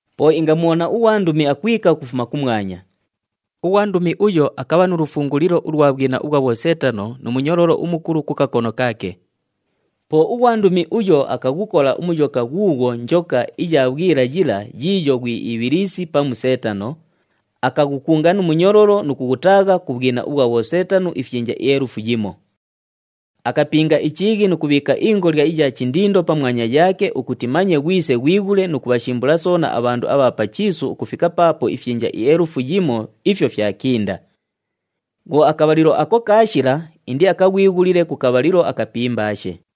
Po ingamubhona ughwandumi akwika ukufuma kumwanya. Ughwandumi uyo akabha nu lufungulilo ulwa bhwina ubhwa bhoseetano nu munyololo umukulu ku kakono kaake. Po ughwandumi uyo akaghukola uMuyoka ghuughwo njoka iya bhwila yila yiiyo ghwi Ibhilisi pamu Seetano, akaghukunga nu munyololo nu kughutaagha ku bhwina ubhwa bhoseetano ifyinja ielufu yimo. Akapinga ichiighi nu kubhiika ingolya iya chindindo pamwanya yaake ukuti manye ghwise ghwighule nu kubhashimbula soona abhandu abha pa chiisu ukufika paapo ifyinja ielufu yimo ifyo fyakinda. Bhwo akabhalilo ako kaashila, indiakaghwighulile ku kabhalilo akapimbaashe.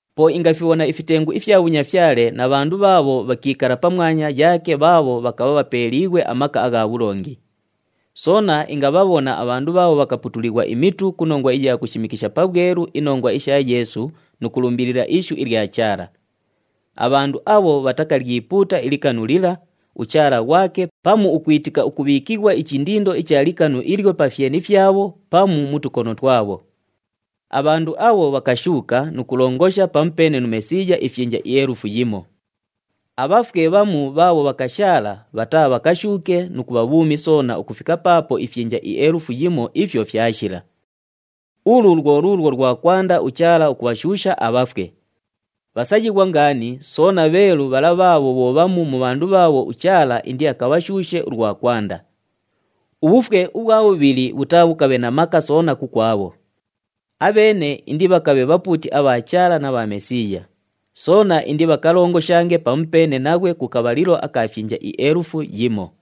Po ingafibhona ifitengu ifya bhunyafyale na bhandu bhaabho bhakiikala pamwanya yaake bhaabho bhakabha bhapeeliighwe amaka agha bhulongi. Soona ingabhabhona abhandu bhaabho bhakaputulighwa imitu ku nongwa iya kushimikisha pabhwelu inongwa isha Yeesu nu kulumbilila ishu ilya Chaala. Abhandu abho bhatakalyipuuta ilikanu lila, uchaala ghwake pamu ukwitika ukubhiikighwa ichindindo icha likanu ilyo pa fyeni fyabho pamu mu tukono twabho. Abhandu abho bhakashuuka nu kulongosha pamupeene nu Mesiiya ifyinja ielufu yimo. Abhafwe bhamu bhaabho bhakashaala bhataabhakashuuke nu kubha bhuumi soona ukufika paapo ifyinja ielufu yimo ifyo fyashila. Ulu lwo luulwo lwa kwanda uChaala ukubhashuusha abhafwe. Bhasayighwa ngaani, soona bheelu bhala bhaabho bho bhamu mu bhandu bhaabho uChaala indiakabhashuushe ulwa kwanda. Ubhufwe ubhwa bhubhili bhutaabhukabhe na maka soona kukwabho. Abheene indibhakabhe bhapuuti abha Chaala na bha Mesiiya, soona indibhakalongoshange pamupeene naghwe ku kabhalilo aka fyinja ielufu yimo.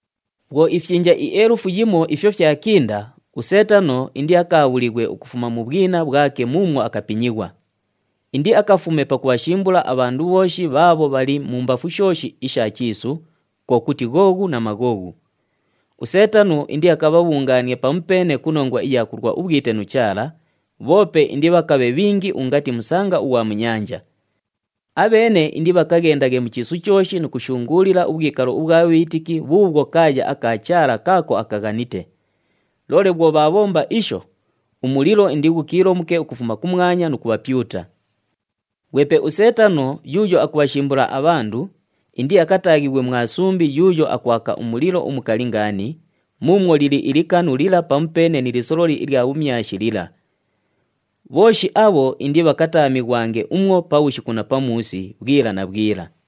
Bhwo ifyinja ielufu yimo ifyo fyakinda, uSeetano indiakaabhulighwe ukufuma mu bhwina bhwake muumwo akapinyighwa. Indiakafume pakubhashimbula abhandu bhooshi bhaabho bhali mumbafu shooshi isha chiisu, kwo kuti Ghoghu na Maghoghu. USeetano indiakabhabhungaanie pamupeene ku nongwa iya kulwa ubhwite nu Chaala, bhoope indibhakabhe bhingi ungati musanga ughwa mu nyanja. Abheene indibhakaghendaghe mu chiisu chooshi nu kushunguulila ubhwikalo ubhwa bhiitiki bhuubhwo kaaya aka Chaala kaako akaghanite. Loole bhwo bhaabhomba isho, umulilo indighukiilomuke ukufuma kumwanya nu kubhapyuta. Ghwepe uSeetano yuuyo akubhashimbula abhandu, indiakataaghighwe mwa sumbi yuuyo akwaka umulilo umukali ngaani, muumwo lili ilikanu lila pamupeene ni lisololi ilya bhumyashi lila. Bhooshi abho indibhakataamighwange umwo pabhushiku na pamuusi, bhwila na bhwila.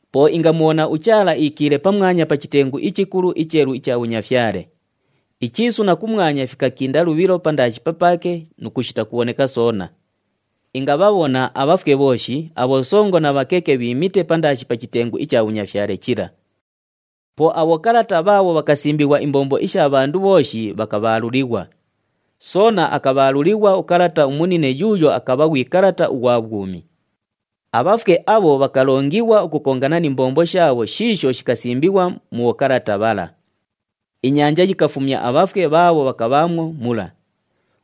Po ingamubhona uChaala iikiile pamwanya pa chitengu ichikulu icheelu icha bhunyafyale. Ichiisu na kumwanya fikakinda lubhilo pandaashi papaake nu kushita kubhoneka soona. Ingabhabhona abhafwe bhooshi, abhosongo na bhakeke bhiimite pandaashi pa chitengu icha bhunyafyale chila. Po abhokalata bhaabho bhakasimbighwa imbombo isha bhandu bhooshi bhakabhaalulighwa. Soona akabhaalulighwa ukalata umunine yuuyo akabha ghwi kalata ughwa bhwumi. Abhafwe abho bhakalongighwa ukukongana ni mbombo shaabho shiisho shikasimbighwa mu bhokalata bhala. Inyanja yikafumya abhafwe bhaabho bhakabhaamwo mula.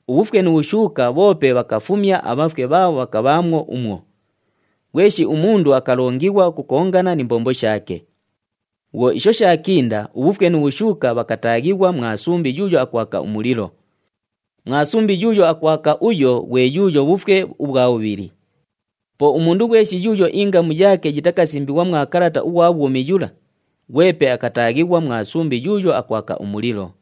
UBhufwe nu Bhushuuka bhoope bhakafumya abhafwe bhaabho bhakabhaamwo umwo. Ghweshi umundu akalongighwa ukukongana ni mbombo shaake. Bhwo isho shaakinda, uBhufwe nu Bhushuuka bhakataaghighwa mwa sumbi yuuyo akwaka umulilo. Mwa sumbi yuuyo akwaka uyo ghwe yuuyo bhufwe ubhwa bhubhili. Po umundu ghweshi yuuyo ingamu yaake yitakasimbighwa mwa kalata ughwa bhwumi yula, ghwepe akataaghighwa mwa sumbi yuuyo akwaka umulilo.